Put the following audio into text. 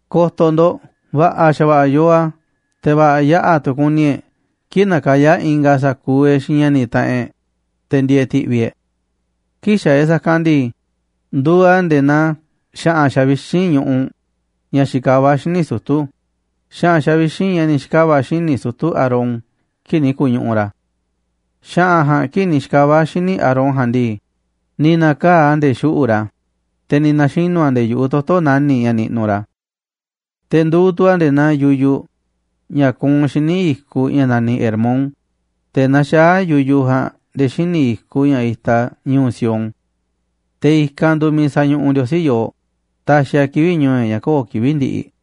Ko̱to̱ ndo̱ꞌ, va̱ꞌa̱ xa̱va̱ꞌa̱ yooꞌ a̱, te̱ va̱ꞌa̱ yaꞌa̱ tu̱ kuni e̱ꞌ kii̱ꞌ nakayá ingaꞌ sa̱kuuꞌ e̱ꞌ xiinꞌ ña̱ni̱ taꞌanꞌ e̱ꞌ, te̱ ndieeꞌ ti̱ꞌvi̱ e̱ꞌ. Kii̱ꞌ xaaꞌ e̱ꞌ sa̱kanꞌ ndii, nduuꞌ a̱ nde̱e̱ naa xa̱ꞌa̱n xavixínꞌ ñuꞌuꞌ ña̱ xikavá xíniꞌ sutu̱, xa̱ꞌa̱n xavixínꞌ ña̱ ni̱ xi̱kava̱ xíniꞌ sutu̱ Aarón kii̱ꞌ ni̱ ku̱ñuꞌuꞌ ra̱. Xa̱ꞌa̱n ja̱a̱nꞌ kii̱ꞌ ni̱ xi̱kava̱ a̱ xíniꞌ Aarón ja̱a̱nꞌ ndii, ni̱ na̱kaa̱ꞌ a̱ nde̱e̱ xuꞌu̱ꞌ ra̱, te̱ ni̱ na̱xinu̱ a̱ nde̱e̱ yu̱ꞌuꞌ toto̱ nani̱ꞌ ña̱ niꞌnuꞌ ra̱. Te̱ nduuꞌ tu̱ a̱ nde̱e̱ naa yuyuꞌ ña̱ kuunꞌ xíniꞌ i̱kuꞌ ña̱ naniꞌ Hermón, te̱ naxaá yuyuꞌ ja̱a̱nꞌ nde̱e̱ xíniꞌ i̱kuꞌ ña̱ itaꞌ ñu̱u̱ Sión. Te̱ i̱kanꞌ nduuꞌ miiꞌ sañuꞌuꞌ Ndiosí yooꞌ, taxiꞌ a̱ kivi̱ꞌ ñu̱u̱ e̱ꞌ ña̱ köo̱ꞌ kivi̱ꞌ ndiꞌiꞌ.